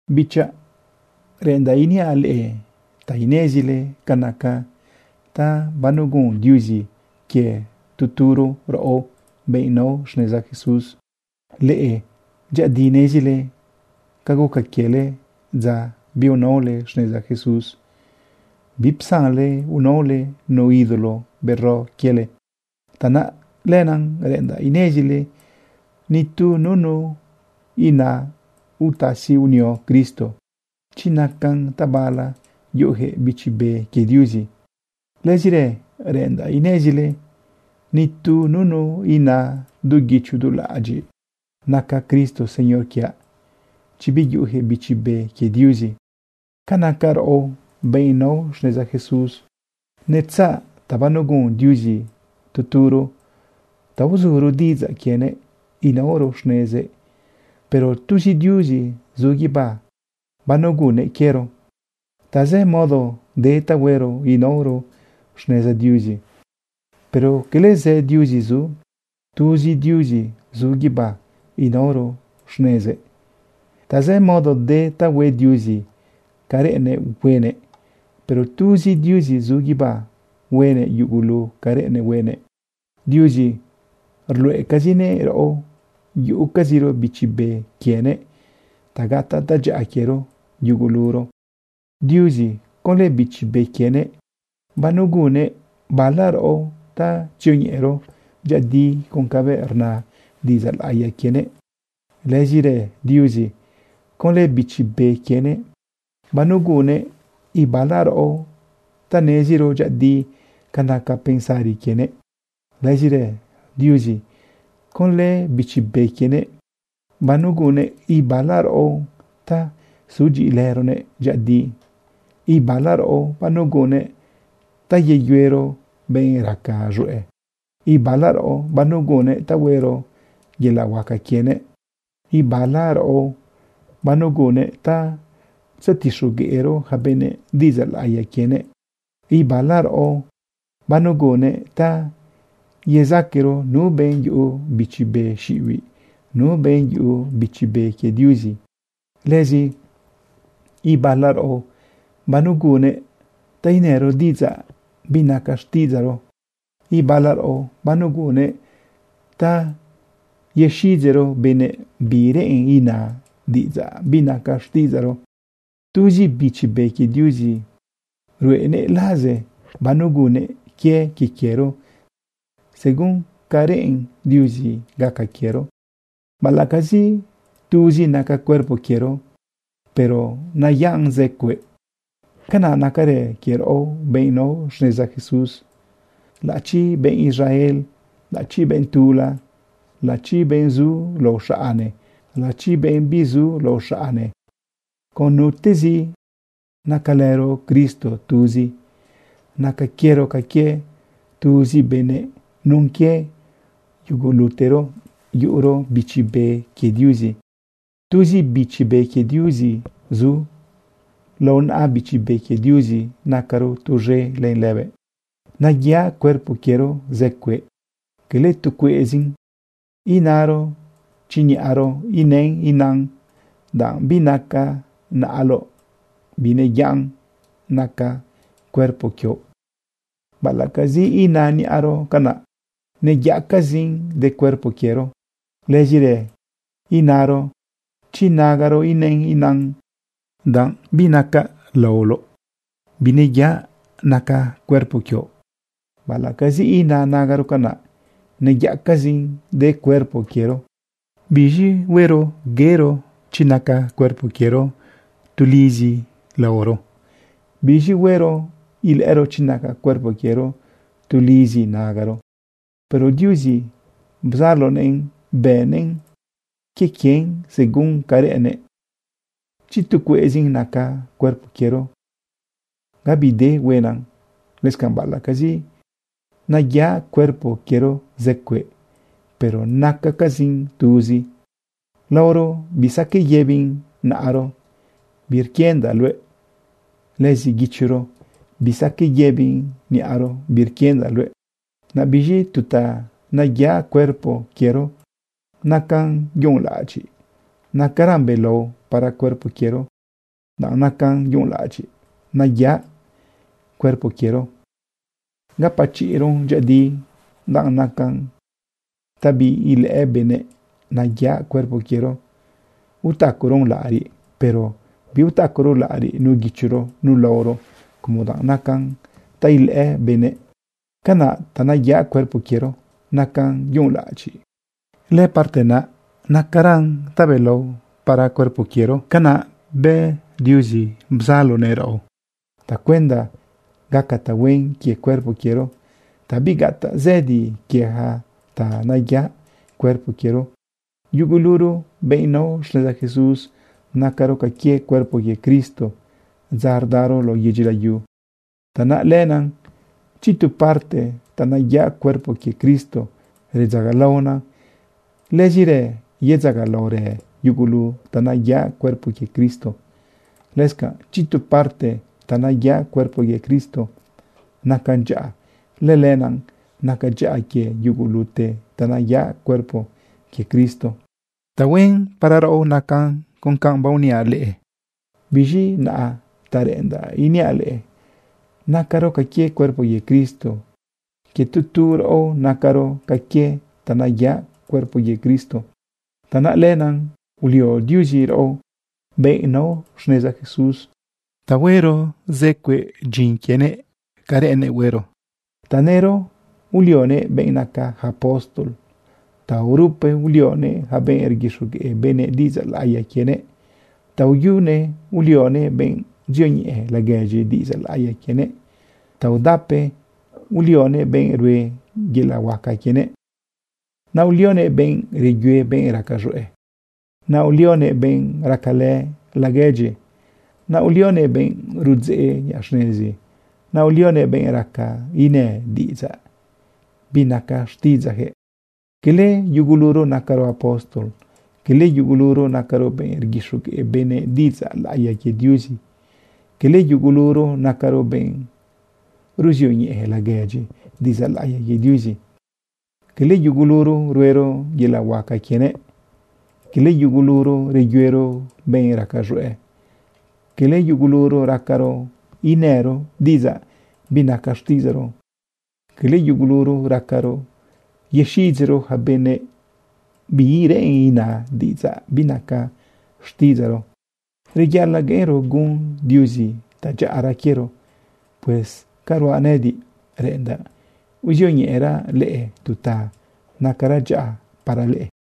Bichaꞌ, reꞌendaꞌ iniaꞌ leꞌe ta inezile ca naca ta banegun Diuzi quie tu turo raꞌo benꞌ nao xneza Jesús. Leꞌe dyëꞌëdi nezile ca guca quiele dza biunaole xneza Jesús, bipsanle unaole nu ídolo bero quiele. Tanaꞌ lenaꞌ reꞌendaꞌ inezile nitu nunu ina utasi unia Cristo chi nacan tabala yuꞌuyaquëꞌ Bichi Be quie Diuzi. Lëzirë reꞌendaꞌ inezile nitu nunu ina du guicho du laꞌadyiꞌ: “Naca Cristo Señor quiaꞌ”, chi biyuꞌuyaquëꞌ Bichi Be quie Diuzi. Ca naca raꞌo benꞌ nao xneza Jesús, netzaꞌ ta banegun Diuzi tu turo ta uzuro diꞌidzaꞌ quienëꞌ inaoro xnezëꞌ. Pero tuzi Diuzi zu guibá banegunnëꞌ quiero. Tazë modo de ta huero inaoro xneza Diuzi, pero cala zë diuzi zu, tuzi Diuzi zu guibá inaoro xnezëꞌ. Tazë modo de ta hue Diuzi ca reꞌennëꞌ huenëꞌ, pero tuzi Diuzi zu guibá huenëꞌ yugulu ca reꞌennëꞌ huenëꞌ. Diuzi ruluꞌecazinëꞌ raꞌo yuꞌucaziro Bichi Be quienëꞌ ta gataꞌ tadyaꞌa quiero yuguluro. Diuzi, conlë Bichi Be quienëꞌ, banegunnëꞌ bala raꞌo ta tzioñeꞌero dyëꞌëdi con cabëꞌ rna diꞌidzaꞌ laꞌiya quienëꞌ. Lëzirë Diuzi, conlë Bichi Be quienëꞌ, banegunnëꞌ ibala raꞌo ta neziro dyëꞌëdi ca naca pensari quienëꞌ. Lëzirë Diuzi, conlë Bichi Be quienëꞌ, banegunnëꞌ ibala raꞌo ta sudyiꞌilëronëꞌ dyëꞌëdi. Ibala raꞌo banegunnëꞌ ta yeyuero benꞌ raca z̃hueꞌ. Ibala raꞌo banegunnëꞌ ta huero yelaꞌ huaca quienëꞌ. Ibala raꞌo banegunnëꞌ ta tzetixogueꞌro yaca benëꞌ diꞌidzaꞌ laꞌiya quienëꞌ. Ibala raꞌo banegunnëꞌ ta yezaquero nu benꞌ yuꞌu bichi be xiꞌibiꞌ, nu benꞌ yuꞌu Bichi Be quie Diuzi. Lëzi ibala raꞌo banegunnëꞌ ta inëro diꞌidzaꞌ binaca xtiꞌidzaꞌro. Ibala raꞌo banegunnëꞌ ta yexiꞌidzeꞌro benëꞌ bi reꞌen ina diꞌidzaꞌ binaca xtiꞌidzaꞌro. Tuzi Bichi Be quie Diuzi ruꞌenëꞌ laze banegunnëꞌ quie quiero según ca reꞌen Diuzi gaca quiero. Baꞌalaꞌcazi tuzi naca cuerpo quiero, pero nayaꞌn zë cueꞌ. Canaꞌ nacarë quie raꞌo benꞌ nao xneza Jesús. Laꞌachi benꞌ Israel, laꞌachi benꞌ tula, laꞌachi benꞌ zu lao xaꞌne, laꞌachi benꞌ bizu zu lao xaꞌne, con nutezi, nacalëro Cristo tuzi. Naca quiero ca quie tuzi benëꞌ nun quie yugulutero yuꞌuro Bichi Be quie Diuzi. Tuzi Bichi Be quie Diuzi zu. Lao naꞌa Bichi Be quie Diuzi nacaro tuz̃e len lëbëꞌ. Nayaꞌ cuerpo quiero zë cueꞌ, cala tu cueꞌzin. Inaro chi niꞌaro inën inan: “Danꞌ binacaꞌ naꞌaloꞌ, bineyaꞌa nacaꞌ cuerpo quioꞌ.” Baꞌalaꞌcazi ina niꞌaro canaꞌ, neyaꞌcazin de cuerpo quiero. Lëzirë inaro chi nagaro inën inan: “Danꞌ binacaꞌ laoloꞌ, bineyaꞌa nacaꞌ cuerpo quioꞌ.” Baꞌalaꞌcazi ina nagaro canaꞌ, neyaꞌcazin de cuerpo quiero. ¿Biz̃i huero yero chi naca cuerpo quiero tulizi laoro? ¿Biz̃i huero ilëꞌëro chi naca cuerpo quiero tulizi nagaro? Pero Diuzi bzalonëꞌn bëꞌnëꞌn quie quien según ca reꞌennëꞌ. Chi tu cueꞌzin naca cuerpo quiero, gabi de huenan. Lëscanꞌ baꞌalaꞌcazi nayaꞌ cuerpo quiero zë cueꞌ, pero nacacazin tuzi. Laoro bisaqueꞌ yëbin naꞌaro: “Birquindaꞌ luëꞌ.” Lëzi guichoro bisaqueꞌ yëbin niꞌaro: “Birquindaꞌ luëꞌ.” Naꞌ biz̃i tu ta neyaꞌ cuerpo quiero nacan yunꞌlaꞌadyiꞌ, nacaran belao para cuerpo quiero. Danꞌ nacan yunꞌlaꞌadyiꞌ nayaꞌ cuerpo quiero, gapachiꞌron dyëꞌëdi. Danꞌ nacan ta biilëꞌë benëꞌ nayaꞌ cuerpo quiero, utacaron laꞌariꞌ. Pero biutacaro laꞌariꞌ nu guichoro nu laoro, como danꞌ nacan ta ilëꞌë benëꞌ. Canaꞌ ta nayaꞌ cuerpo quiero nacan yunꞌlaꞌadyiꞌ, lëparte naꞌ nacaran tabelao para cuerpo quiero. Canaꞌ bë Diuzi bzalonëꞌ raꞌo tacuenda gaca tahuen quie cuerpo quiero, ta bigataꞌ zëdi quie yaca ta nayaꞌ cuerpo quiero. Yuguluro benꞌ nao xneza Jesús, nacaro ca quie cuerpo quie Cristo dza rdaro lao yedyi layu. Tanaꞌ lenaꞌ chi tu parte ta nayaꞌ cuerpo quie Cristo redzagalaona, lëzirë yedzagalaorë yugulu ta nayaꞌ cuerpo quie Cristo. Lëscanꞌ chi tu parte ta nayaꞌ cuerpo quie Cristo nacan dyaꞌa, lëlenaꞌ nacan dyaꞌa quie yugulute ta nayaꞌ cuerpo quie Cristo. Tahuen para raꞌo nacan con baoniaꞌ leꞌe. Biz̃i naꞌa ta reꞌendaꞌ iniaꞌ leꞌe nacaro ca quie cuerpo quie Cristo. Quie tu tu raꞌo nacaro ca quie ta nayaꞌ cuerpo quie Cristo. Tanaꞌ lenaꞌ ulio Diuzi raꞌo, benꞌ nao xneza Jesús, ta huero zë cueꞌ dyin quienëꞌ ca reꞌennëꞌ huero. Tanëro ulioguëꞌ benꞌ naca yaca apóstol. Taorupe ulioguëꞌ yaca benꞌ rguixogueꞌ benëꞌ diꞌidzaꞌ laꞌiya quienëꞌ. Taoyune ulioguëꞌ benꞌ ruzioñeꞌe laguedyi diꞌidzaꞌ laꞌiya quienëꞌ. Taodape ulioguëꞌ benꞌ rue yelaꞌ huaca quienëꞌ. Naꞌ ulioguëꞌ benꞌ reyue benꞌ raca z̃hueꞌ. Naꞌ ulioguëꞌ benꞌ racalë laguedyi. Naꞌ ulioguëꞌ benꞌ rudzeꞌ niꞌa xnezi. Naꞌ ulioguëꞌ benꞌ raca inë diꞌidzaꞌ binaca xtiꞌidzaꞌyaquëꞌ. Cala yuguluro nacaro apóstol. Cala yuguluro nacaro benꞌ rguixogueꞌ benëꞌ diꞌidzaꞌ laꞌiya quie Diuzi. Cala yuguluro nacaro benꞌ ruzioñeꞌe laguedyi diꞌidzaꞌ laꞌiya quie Diuzi. Cala yuguluro ruero yelaꞌ huaca quienëꞌ. Cala yuguluro reyuero benꞌ raca z̃hueꞌ. Cala yuguluro racaro inëro diꞌidzaꞌ binaca xtiꞌidzaꞌro. Cala yuguluro racaro yexiꞌidzeꞌro yaca benëꞌ bi reꞌen ina diꞌidzaꞌ binaca xtiꞌidzaꞌro. Reyaꞌalaꞌ gueꞌenro gun Diuzi tadyaꞌara quiero. Pues ca ruaꞌ nëꞌëdiꞌ, reꞌendaꞌ uzioñeꞌeraꞌ leꞌe tu ta nacara dyaꞌa para leꞌe.